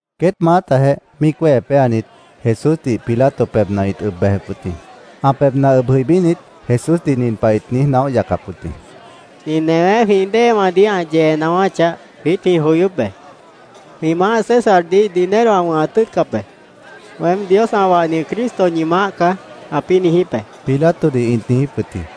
Queét maátajeh míic wéhe péanit, Jesúsdih Pilato pebhna ĩt ʉb bejep wʉt jĩ. Ã pebhna ʉb jʉibínit, Jesúsdih nin pah ĩt niíj naóh yacap wʉt jĩ: —Nin newé jwĩ déewãdih ã yee naáwáchah, jwiít jwĩ joyóp be. Jwĩ maáh Césardih dinero ã wʉ̃hat tʉ́ʉtcap be. ‘Weém Dios ã wahni Cristo ñi maáh caá’, ãpĩ́ niijíp be, Pilatodih ĩt niijíp wʉt jĩ.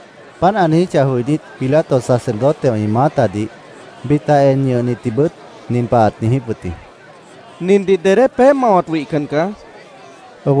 Páant ã niijíchah joinít, Pilato sacerdotewã ĩ maátadih, bita en ñʉhnitdihbʉt nin pah ãt niijíp wʉt jĩ: —Nindih dedé peéh mawat wihcan caá, ãt niijíp wʉt jĩ.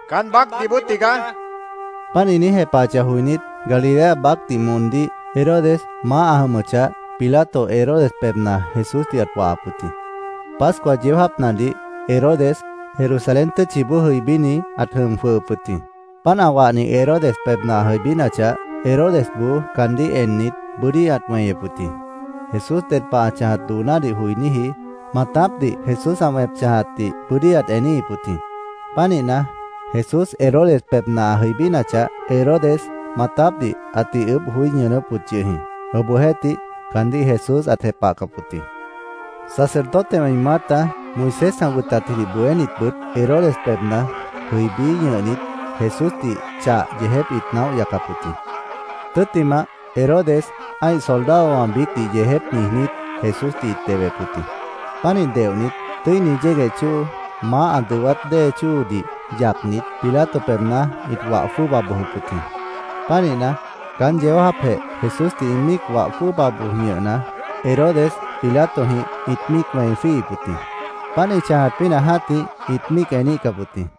—Caán baácdih bóo tigaá, ĩt niíj jepahap wʉt jĩ. Páant ĩ niíj jepahachah joinít, Galilea baácdih moondíh Herodes maáh ã jʉmʉchah, Pilato Herodes pebhna Jesúsdih ãt wahap wʉt jĩ. Pascua yeó jáapnadih Herodes Jerusalén tʉ́tchiboó jʉibíni ãt jʉm jwʉhʉp wʉt jĩ. Páant ã wahni Herodes pebhna ã jʉibínachah, Herodesboó caandíh ennit, bʉ́dí ãt weñep wʉt jĩ. Jesús ded pah ã chãjat doonádih joiníji maatápdih Jesús ã wẽp chãjatdih bʉ́dí ãt eníhip wʉt jĩ. Pánihna, Jesús Herodes pebhna ã jʉibínachah, Herodes maatápdih ãtih ʉʉ́bh joí ñʉʉnʉ́p wʉt yʉh jĩ. Obohjeéhtih, caandíh Jesús ãt jepahcap wʉt jĩ. Sacerdotewã ĩ maáta, Moisés ã wʉtatjidih bohénitbʉt, Herodes pebhna jʉibí ñʉhnit, Jesúsdih chah yeejép ĩt naóh yacap wʉt jĩ. Tʉ́ttimah, Herodes ã́ih soldadowã biícdih yeejép niijnít, Jesúsdih ĩt dehwep wʉt jĩ. Pánih deohnit, tʉ́ini yégueh chóo, maáh ã dʉwát dée chóodih yacnit, Pilato pebhna ĩt wah jwʉ́ʉba bojop wʉt jĩ. Pánihna, caán yeó jáapjeh Jesúsdih ĩ míic wah jwʉ́ʉba boj ñʉhna, Herodes Pilatojĩh ĩt míic wẽi jwíihip wʉt jĩ. Páant ĩ chãjat pínah jã́tih ĩt míic eníhcap wʉt jĩ.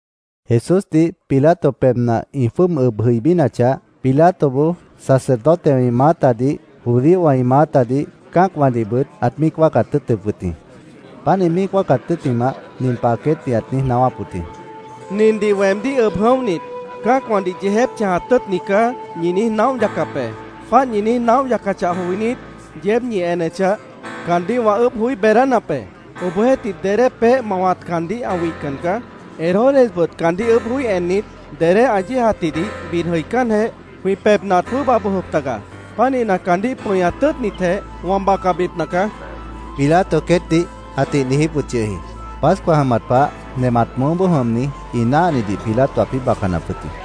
Jesúsdih Pilato pebhna ĩ jwʉ́ʉb ʉb jʉibínachah, Pilatoboó sacerdotewã ĩ maátadih, judíowã ĩ maátadih, cã́acwãdihbʉt ãt míic wáacat tʉ́ʉtʉp wʉt jĩ. Páant ĩ míic wáacat tʉ́ttimah, nin pah queétdih ãt niíj naáwáp wʉt jĩ: —Nindih weemdíh ʉb jʉ̃óhnit, ‘Cã́acwãdih yeejép chãjat tʉ́ʉtni caá’, ñi niíj naóh yacap be. Páant ñi niíj naóh yacachah joinít, yeéb ñi enechah, caandíh wã ʉʉ́bh joí beedánap be. Obohjeéhtih, dedé peéh mawat caandíh ã wihcan caá. Herodesbʉt caandíh ʉʉ́bh joí ennit, dedé ã yéejatjidih bid jʉicánjeh, jwĩ pebhna ãt jwʉ́ʉba bojop taga. Pánihna, caandíh pʉñat tʉ́ʉtnitjeh, wã bacabipna caá, Pilato queétdih ãtih niijíp wʉt yʉh jĩ. Pascua jʉmat pah nemat mʉʉ́boó jʉmni ĩ náahnidih Pilato ãpĩ́ bacanap wʉt jĩ.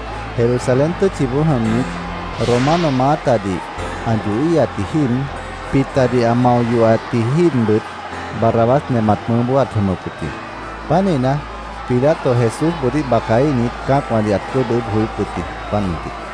Jerusalén tʉ́tchiboó jʉmnit Romano maátadih ã yohíhatji jíib, bitadih ã mao yohatji jíibbʉt, Barrabás nemat mʉʉ́boó ãt jʉmʉp wʉt jĩ. Pánihna, Pilato Jesúsboodíh bacaíhnit, cã́acwãdih ãt jwʉ́ʉb ʉʉ́bh joyóp wʉt jĩ, páant mʉntih.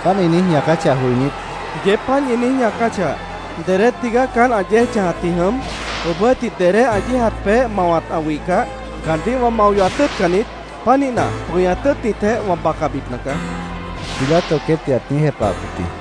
Páant ĩ niíj ñaacáchah joinít, —Yeéb páant ñi niíj ñaacáchah, ¿dedé tigaá caán ã yéej chãjatji jʉm? Obohjeéhtih, dedé ã yéejat peéh mawat ã wihcah, caandíh wã mao yohat tʉ́ʉtcan niít. Pánihna, pʉñat tʉ́ʉtnitjeh, wã bacabipna caá, Pilato queétdih ãt niíj jepahap wʉt jĩ.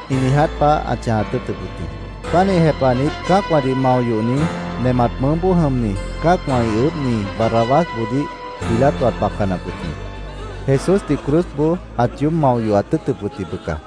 ĩ niiját pah ãt chãjat tʉ́ʉtʉp wʉt jĩ. Pánih jepahnit, cã́acwãdih mao yohni, nemat mʉʉ́boó jʉmni, cã́acwã ĩ ʉʉ́bhni Barrabásboodíh Pilato ãt bacanap wʉt jĩ. Jesúsdih cruzboó ãt yoób mao yohat tʉ́ʉtʉp wʉt jĩ, bʉca.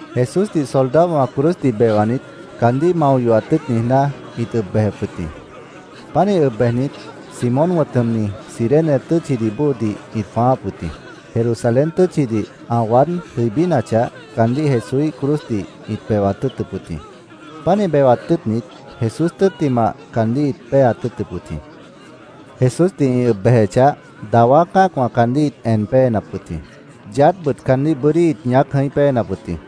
Jesúsdih soldadowã cruzdih bewanit, caandíh mao yohat tʉ́ʉt niijná, ĩt ʉb bejep wʉt jĩ. Pánih ʉb bejnit, Simón wʉ̃t jʉmni, Cirene tʉ́tchidih bóodih ĩt jwãááp wʉt jĩ. Jerusalén tʉ́tchidih ã waád jʉibínachah, caandíh Jesúíh cruzdih ĩt bewat tʉ́ʉtʉp wʉt jĩ. Pánih bewat tʉ́ʉtnit, Jesús tʉ́ttimah caandíh ĩt péeat tʉ́ʉtʉp wʉt jĩ. Jesúsdih ĩ ʉb bejechah, dawá cã́acwã caandíh ĩt en péenap wʉt jĩ. Yaádhbʉt caandíh bʉ́dí ĩt ñaác jʉ̃í péenap wʉt jĩ.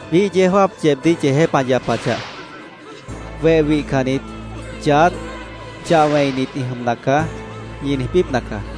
Biíh yeó jáap yeebdíh yeejép ã yapachah, ‘Weh wihcannit yaádh chah wẽinit ĩ jʉmna caá’, ñi niijbípna caá.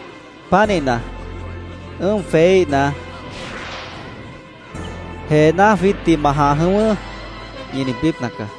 Pánihna, ʉ́ʉm jweííhna, ‘¡Jeená jwiítdih ma jãh jʉ̃ʉ́wʉ́!’ ñi niijbípna caá.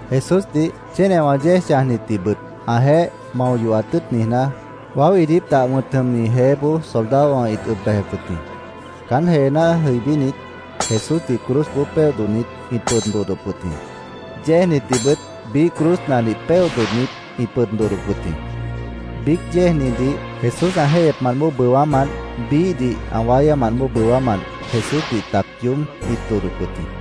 Jesúsdih, chénewã yéej chãjnitdihbʉt ãjeéh mao yohat tʉ́ʉt niijná, Waó Iidíp Dah wʉ̃t jʉmni jeéboó soldadowã ĩt ʉb bejep wʉt jĩ. Caán jeená jʉibínit, Jesúsdih cruzboó péohnit, ĩt pʉd dodhdop wʉt jĩ. Yéejnitdihbʉt biíh cruznadih péohnit, ĩt pʉd dodhdop wʉt jĩ. Biíc yéejnidih Jesús ã jéihyepmant bóo bʉwámant, biíhdih ã wáyámant bóo bʉwámant, Jesúsdih tac yoób ĩt dodhdop wʉt jĩ.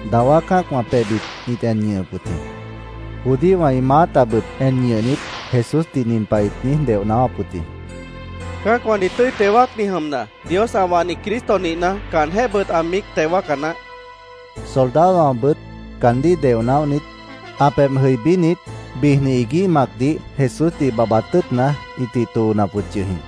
Dawá cã́acwã pebhbit ĩt en ñʉhʉp wʉt jĩ. Judíowã ĩ maátabʉt en ñʉhnit, Jesúsdih nin pah ĩt niíj deoh naáwáp wʉt jĩ: —Cã́acwãdih tʉ́i teo wáacni jʉmna, Dios ã wahni Cristo nihna, caanjéhbʉt ã míic teo wáaca naáh, ĩt niijíp wʉt jĩ. Soldadowãbʉt caandíh deoh naóhnit, ã pebh jʉibínit, bijni iguíh macdih Jesúsdih babhbat tʉ́ʉtna, ĩtih toonap wʉt yʉh jĩ.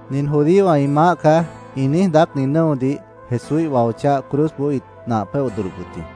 “Nin judíowã ĩ maáh caá”, ĩ niíj daácni nʉ́odih Jesúíh wao cháh cruzboó ĩt nah péoh bʉ́ʉdhdʉp wʉt jĩ.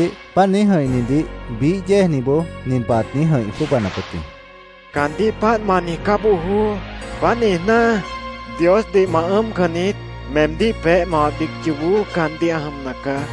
Obohjeéhtih, páant niíj jʉ̃ihnidih biíh yéejniboó nin pah ãt niíj jʉ̃ih jwʉ́ʉbanap wʉt jĩ: —¡Caandíh páant ma niijcá bojoó! ¿Páant niijná, Diosdih ma ʉ́ʉmcan niít? Meemdíh peéh mawat biíc yoobó caandíh ã jʉmna caá.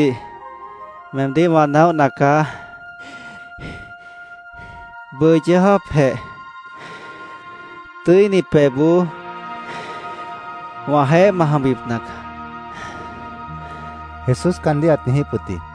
—Yoobópdih meemdíh wã naóhna caá. Bʉʉ yeó jáapjeh Tʉ́ini Pebhboó wãjeéh ma jʉmbipna caá, Jesús caandíh ãt niijíp wʉt jĩ.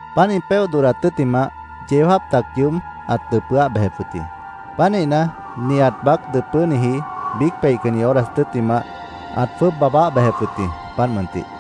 Páant ĩ péoh dodhdat tʉ́ttimah, yeó jáap tac yoób ãt dʉpʉ́áh bejep wʉt jĩ. Pánihna, nihat baác dʉpʉ́niji biíc peihcanni horas tʉ́ttimah ãt jwʉ́ʉb baabáh bejep wʉt jĩ, páant mʉntih.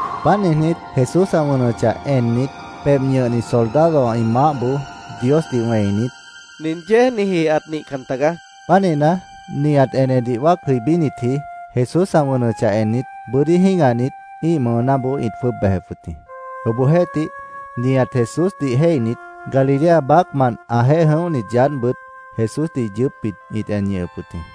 Páant niijnít, Jesús ã wʉnʉchah ennit, pebh ñʉhni soldadowã ĩ maáhboó Diosdih wẽinit, —Nin yéejniji ãt nihcan tagaá, ãt niijíp wʉt jĩ. Pánihna, nihat enedih wáac jʉibínitji Jesús ã wʉnʉchah ennit, bʉ́dí jĩ́gahnit, ĩ́ih mʉʉnáboó ĩt jwʉ́ʉb bejep wʉt jĩ. Obohjeéhtih, nihat Jesúsdih jéihnit, Galilea baácmant ãjeéh jʉ̃óhnit yaádhbʉt Jesúsdih yʉʉ́pbit ĩt en ñʉhʉp wʉt jĩ.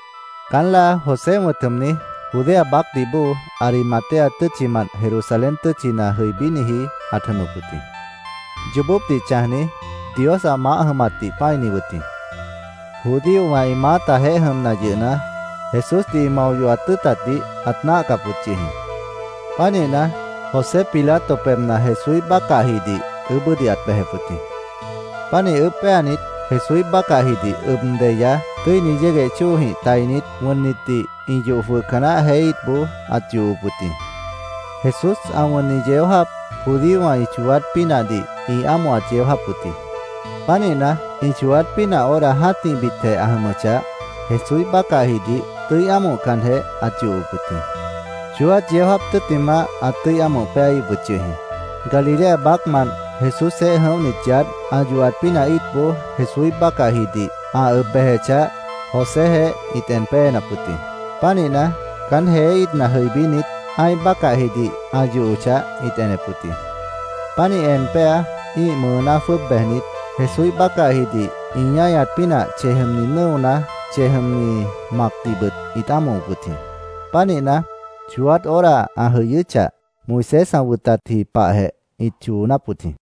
Caán láa José wʉ̃t jʉmni, Judea baácdih bóo, Arimatea tʉ́tchimant Jerusalén tʉ́tchina jʉibíniji ãt jʉmʉp wʉt jĩ. Yoobópdih chãjni, Dios ã maáh jʉmatdih pã́ini wʉt jĩ. Judíowã ĩ maátajeéh jʉmna yʉhna, Jesúsdih ĩ mao yohat tʉ́ʉtatdih ãt náahcap wʉt yʉh jĩ. Pánihna, José Pilato pebhna Jesúíh bácahjidih ʉʉ́bʉ́dih ãt bejep wʉt jĩ. Pánih ʉʉ́bh péanit, Jesúíh bácahjidih ʉb deya, tʉ́ini yégueh chóojĩh tainit, wʉnnitdih ĩ yoh jwʉhca naáh jeé íitboó ãt yohop wʉt jĩ. Jesús ã wʉnni yeó jáap judíowã ĩ chooát pínahdih ĩ ámohat yeó jáap wʉt jĩ. Pánihna, ĩ chooát pínah hora jã́tihbitjeh ã jʉmʉchah, Jesúíh bácahjidih tʉ́i ámohcanjeh ãt yohop wʉt jĩ. Chooát yeó jáap tʉ́ttimah ãt tʉ́i ámoh péaíhip wʉt yʉh jĩ. Galilea baácmant Jesúsjeéh jʉ̃óhnit yaádh, ã yohat pínah íitboó Jesúíh bácahjidih ã ʉb bejechah, Joséjeéh ĩt en péenap wʉt jĩ. Pánihna, caán jeé íitna jʉibínit, ã́ih bácahjidih ã yohochah, ĩt enep wʉt jĩ. Pánih en péa, ĩ́ih mʉʉná jwʉ́ʉb bejnit, Jesúíh bácahjidih ĩ ñáñat pínah chej jʉmni nʉ́ona, chej jʉmni macdihbʉt ĩt ámohop wʉt jĩ. Pánihna, chooát hora ã jʉyʉ́chah, Moisés ã wʉtatji pahjeh ĩt choonáp wʉt jĩ.